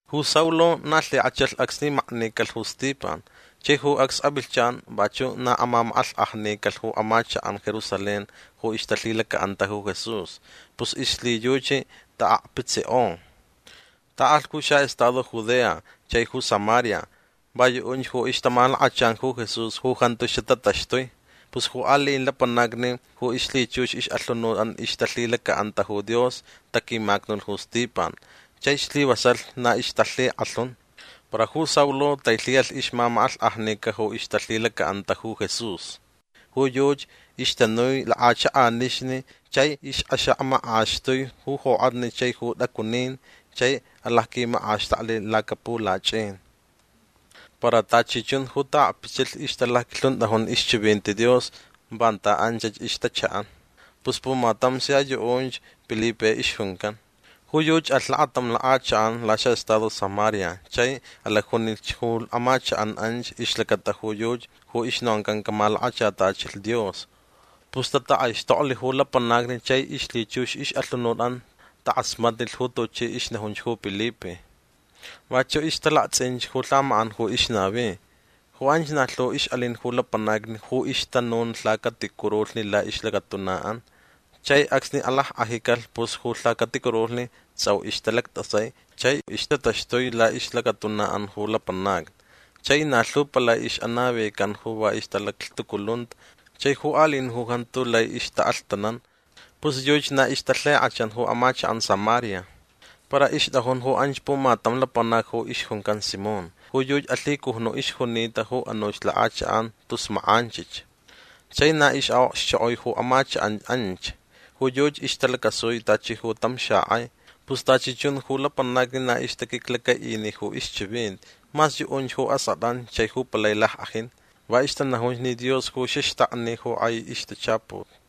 Ju Saulo na lhik'achalh acsni maknicalh ju Stipan. Chai ju acs avilhchan vachu' na amamak'alhk'ajnicalh ju amachak'an Jerusalén ju ixtalhilaca'anta ju Jesús. Pus ixlhiyuchi ta'akpitsik'o. Ta'alh ju xa'estado Judea chai ju Samaria. Va yu'unch ju ixtamalakachan ju Jesús ju jantu xatataxtui. Pus ju ali'in lapanacni ju ixlhichux ix'alhunut'an ixtalhilaca'anta ju Dios taquimacnulh ju Stipan. Chai slivasalh na ixtalhik'alhun. Para ju Saulo tailhi'alh ixmamak'alhk'ajnica ju ixtalhilaca'anta ju Jesús. Ju yuchi ixtanui lak'achak'anixni chai ix'axak'amaxtui ju jok'atni chai t'acunin chai alacquimak'axtakcalh lacapulach'in. Para tachi chun ju ta'akpitsilh ixtalacquilhunt'ajun ixchivinti Dios vanta anchach ixtacha'an. Pus pumatam sia yu'unch Pilipe ixjuncan. Ju yuchi alh lakatam lak'achak'an laxa'estado Samaria chai alacjunich ju amachak'an anch ixlacata ju yuchi ju ixnoncan camalakachatachilh Dios. Pus tatak'aixtoklh ju lapanacni chai ixlhichux ix'alhunut'an tak'asmatnilh ju tuchi ixnajunch ju Pilipe. Vachu' ixtalakts'inch ju lhamak'an ju ixnavi. Ju anch na lhu ix'alin ju lapanacni ju ixtanun ju lhacaticurulhni la'ix'alhunut'an. Chai acsni alack'ajicalh pus ju lhacaticurulhni ts'au ixtalact'asai chai ixtataxtui la'ixlacatuna'an ju lapanacni. Chai na lhu palai ix'anavicanta ju va ixtalaclhtuculunta chai ju ali'in ju jantu lai ixta'alhtanan. Pus yuchi na ixtalhik'achan ju amachak'an Samaria. Para ixt'ajun ju anch pumatam lapanac ju ixjuncan Simón. Ju yuchi alhicujnu' ixjunita ju anuch lak'achak'an tus mak'anchich. Chai na ix'a'okxchok'oi ju amachak'an anch. Ju yuchi ixtalacasui tachi ju tam xak'ai. Pus tachi chun ju lapanacni na ixtaquiclaca'ini ju ixchivinti. Mas yu'unch ju ask'at'an chai ju palai lack'ajin. Va ixtanajunch ni Dios ju xaxtakni ju k'ai ixtachaput.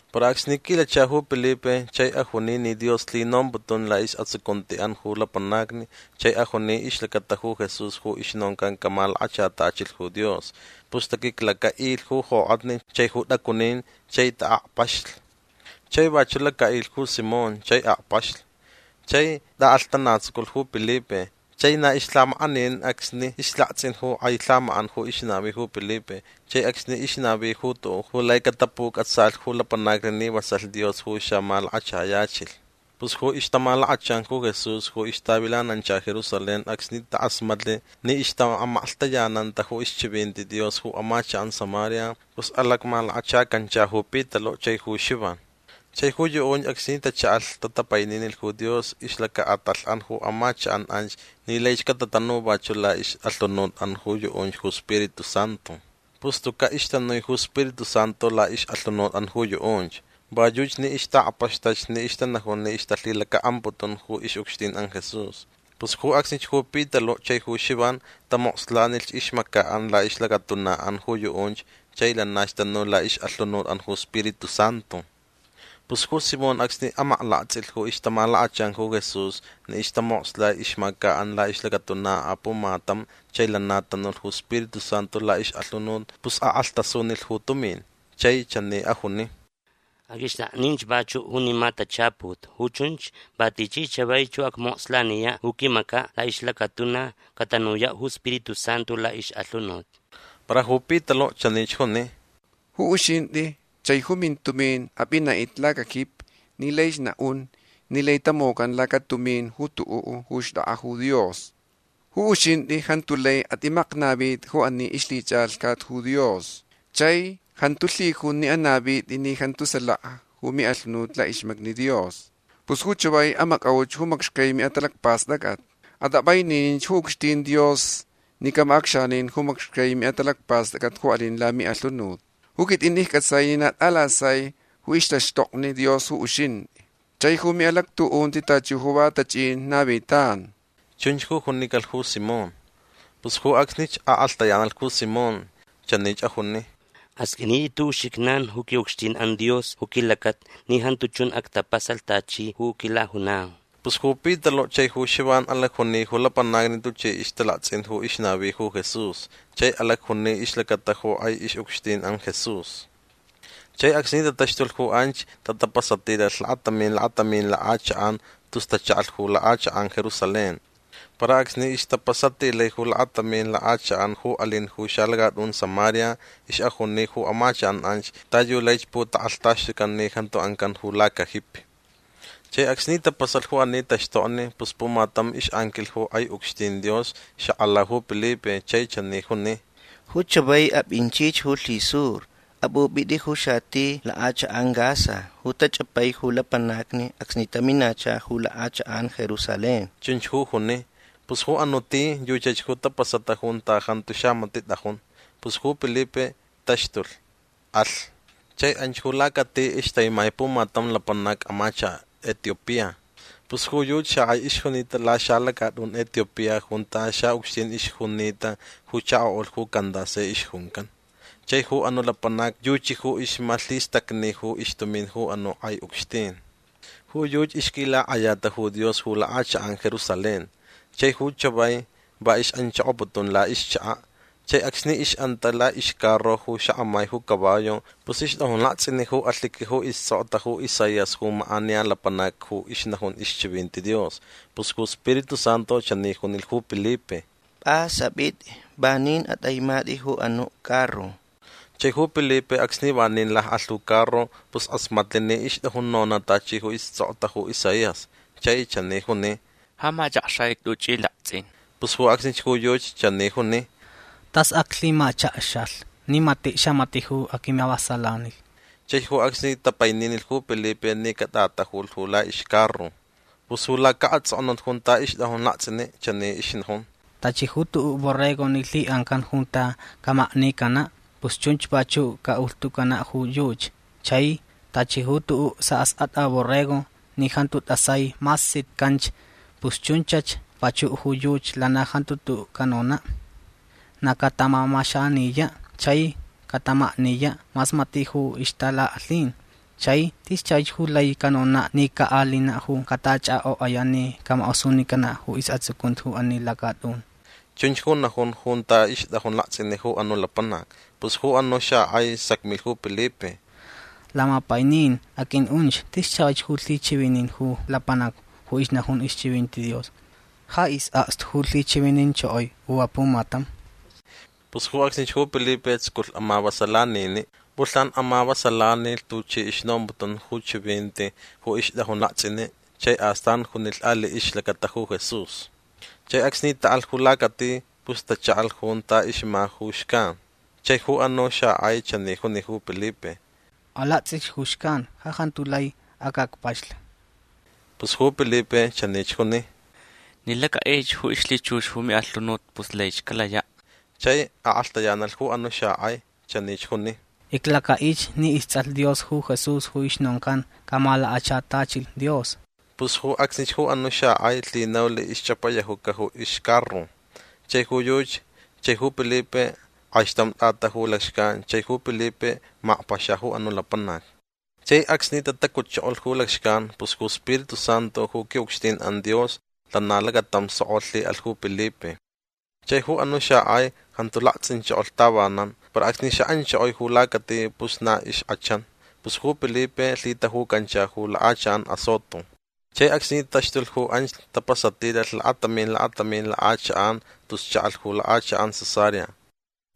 Para acsni quilacha ju Pilipe chai ajuni ni Dios lhinomputun la'is'atsucunti'an ju lapanacni chai ajuni ixlacata ju Jesús ju ixnoncan camalakachatachilh ju Dios pus taquiclaca'ilh ju jok'atni chai ju t'acunin chai ta'akpaxlich. Chai vachu' laca'ilh ju Simón chai akpaxlh. Chai t'a'alhtanatsuculh ju Pilipe. Chai na ixlhamak'aninin acsni ixlakts'in ju k'ai lhamak'an ju ixnavi ju Pilipe chai acsni ixnavi ju tu'u' ju lai catapuc'atsalh ju lapanacni ni vasalh Dios ju xamalakachayachilh. Pus ju ixtamalakachan ju Jesús ju ixtavilanancha Jerusalén acsni tak'asmatlh ni ixta'amaklhtayananta ju ixchivinti Dios ju amachak'an Samaria pus alacmalakachacancha ju Pitalu' chai ju Xivan. Chai ju yu'unch acsni tacha'alh tatapaininilh ju Dios ixlaca'atalh'an ju amachak'an anch ni laich catanu vachu' la'ix'alhunut'an ju yu'unch ju Spiritu Santu. Pus tuca' ixtanui ju Spiritu Santu la'ix'alhunut'an ju yu'unch. Va yuchi ni ixta'akpaxtach ni ixtanajun ni ixtalhilaca'amputun ju ix'ucxtin'an Jesús. Pus ju acsnich ju Pitalu' chai ju Xivan tamokslanilhch ixmaca'an la'ixlacatuna'an ju yu'unch chai lanach tanu la'ix'alhunut'an ju Spiritu Santu. Pus ju Simón acsni amaklakts'ilh ju ixtamalakachan ju Jesús ni ixtamokslai ixmaca'an la'ixlacatuna apumatam chai lana tanulh ju Spiritu Santu la'ix'alhunut pus ak'alhtasunilh ju tumin. Chai chani ajuni: ―Aq'uixt'akninch vachu' junima tachaput. Ju chunch va tichi chavaich ju acmokslaniya' ju quimaca' la'ixlacatuna catanuya' ju Spiritu Santu la'ix'alhunut. Para ju Pitalu' chanich juni: ―Ju uxint'i chai ju mintumin ap'ina'it'it lacajipi ni laich na'un ni laich tamocan lacatumin ju tu'u' ju xt'ak'a ju Dios. Ju uxint'i jantu lai at'imaknavit'i ju ani ixlhich'alhcat ju Dios. Chai jantu lhijun ni anavit'i ni jantu salaka ju mi'alhunut la'ixmacni Dios. Pus ju chavai amac'auch ju macxcai mi'atalacpast'ac'at. At'ap'aininin ju ucxtin Dios ni camac'acxanin ju macxcai mi'atalacpast'ac'at ju alin lami'alhunut. Ju quit'in icc'atsai ni na t'alasai ju ixtaxtokni Dios ju uxint'i. Chai ju mi'alactu'unti tachi ju va tach'in navitan. ―Chunch ju junicalh ju Simón. Pus ju acsnich ak'alhtayanalh ju Simón. Chanich ajuni: ―Asq'uinit'it ju uxijnan ju qui'ucxtin'an Dios ju quilacata ni jantu chun actapasalh tachi ju quilajunau. Pus ju Pitalu' chai ju Xivan alacjuni ju lapanacni tuchi ixtalakts'in ju ixnavi ju Jesús chai alacjuni ixlacata ju k'ai ix'ucxtin'an Jesús. Chai acsni tataxtulh ju anch tatapasatilalh lakatamin lakatamin lak'achak'an tus tacha'alh ju lak'achak'an Jerusalén. Para acsni ixtapasatilai ju lakatamin lak'achak'an ju alin ju xalacat'un Samaria ix'ajuni ju amachak'an anch ta yu laich putak'alhtaxtucan ni jantu ancan ju lacajipi. Chai acsni tapasalh ju ani taxtokni pus pumatam ix'anquilh ju k'ai ucxtin Dios xak'ala ju Pilipe chai chani juni: ―Ju chavai ap'inchich ju lhisur. Ap'up'it'i ju xati lak'achak'an Gaza ju tach'apai ju lapanacni acsni taminacha ju lak'achak'an Jerusalén. ―Chunch ju juni. Pus ju anu' ti yuchach ju tapasata junta jantu xamati' t'ajun. Pus ju Pilipe taxtulh. Alh. Chai anch ju lacati ixtaimai pumatam lapanac amachaka' Etiopía. Pus ju yuchi xak'ai ixjunita laxalacat'un Etiopía junta xa'ucxtin ixjunita ju chako'ulh ju Candace ixjuncan. Chai ju anu' lapanac yuchi ju ixmalhistacni ju ixtumin ju anu' k'ai ucxtin. Ju yuchi ixquilak'ayata ju Dios ju lak'achak'an Jerusalén. Chai ju chavai va ix'anchokoputun la'ixchaka'. Chai acsni ix'anta la'ixcarro ju ixak'amai ju caballo pus ixt'ajun lakts'ini' ju alhiqui ju ists'okta ju Isaías ju mak'aniya lapanac ju ixnajun ixchivinti Dios. Pus ju Spiritu Santu chani junilh ju Pilipe: ―P'as ap'it'i. Vanin at'aimat'i ju anu' carro. Chai ju Pilipe acsni vanin lak'alh ju carro pus k'asmatlh ni ixt'ajun nona' tachi ju ists'okta ju Isaías. Chai chani juni: ―Ja mach'akxaich tuch'i lakts'in. Pus ju acsnich ju yuchi chani juni: ―Tas aclhimachakxalh ni mati' xamati' ju aquimavasalanilh. Chai ju acsni tapaininilh ju Pilipe ni cat'atajulh ju la'ixcarro. Pus ju laca'ats'oknut junta ixt'ajun lakts'ini' chani ixnajun: Tachi ju tu'u' borrego ni lhi'ancan junta camaknicana' pus chunch vachu' ca'ulhtucana' ju yuchi. Chai tachi ju tu'u' sa'ask'at'a borrego ni jantu t'asai mas sitcanch pus chunchach vachu' ju yuchi. Lana jantu tu'u' canona'. Na catamamaxaniya' chai catamakniya' mas mati' ju ixtalak'alhin. Chai tis chavaich ju lai canona' ni ca'alina' ju catach'ak'ok'aya' ni camak'osunicana' ju is'atsucunti ju ani lacat'un. Chunch ju najun junta ixt'ajun lakts'ini' ju anu' lapanac. Pus ju anu' xak'ai sacmilh ju Pilipe: ―Lamapainin aq'ui'unch. Tis chavaich ju lhichivinin ju lapanac ju ixnajun ixchivinti Dios. Ja is'akstu ju lhichivininchokoi u apumatam. Pus ju acsnich ju Pilipe tsuculh amavasalanini'. P'ulhnan amavasalanilh tuchi ixnomputun ju chivinti ju ixt'ajun lakts'ini' chai astan junilh ali' ixlacata ju Jesús. Chai acsni ta'alh ju lacati pus tacha'alh junta ixma ju xcan. Chai ju anu' xak'ai chani juni ju Pilipe: ―Alakts'ich ju xcan. Ja jantu lai ac'akpaxlh. Pus ju Pilipe chanich juni: ―Ni lac'a'ich ju ixlhichux ju mi'alhunut pus laich calaya'. Chai ak'alhtayanalh ju anu' xak'ai. Chanich juni: ―Iclaca'ich ni ists'alh Dios ju Jesús ju ixnoncan camalakachatachilh Dios. Pus ju acsnich ju anu' xak'ai lhinaulh ixch'apayajuca ju ixcarro. Chai ju yuchi chai ju Pilipe k'aixtamch t'ataju lacxcan chai ju Pilipe makpaxa ju anu' lapanac. Chai acsni tatacutchokolh ju lacxcan pus ju iSpiritu Santu ju qui'ucxtin'an Dios lana lacatam sok'o lhi'alh ju Pilipe. Chai ju anu' xak'ai jantu lakts'inchokolh tavanan. Para acsni xa'anchokoi ju lacati pus na ixk'achan. Pus ju Pilipe lhitajucancha ju lak'achak'an Azoto. Chai acsni taxtulh ju anch tapasatilalh lakatamin lakatamin lak'achak'an tus cha'alh ju lak'achak'an Cesarea.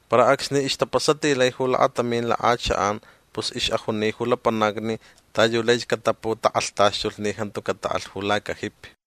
Para acsni ixtapasatilai ju lakatamin lak'achak'an pus ix'ajuni ju lapanacni ta yu laich cataputak'alhtaxtulh ni jantu cata'alh ju lacajipi.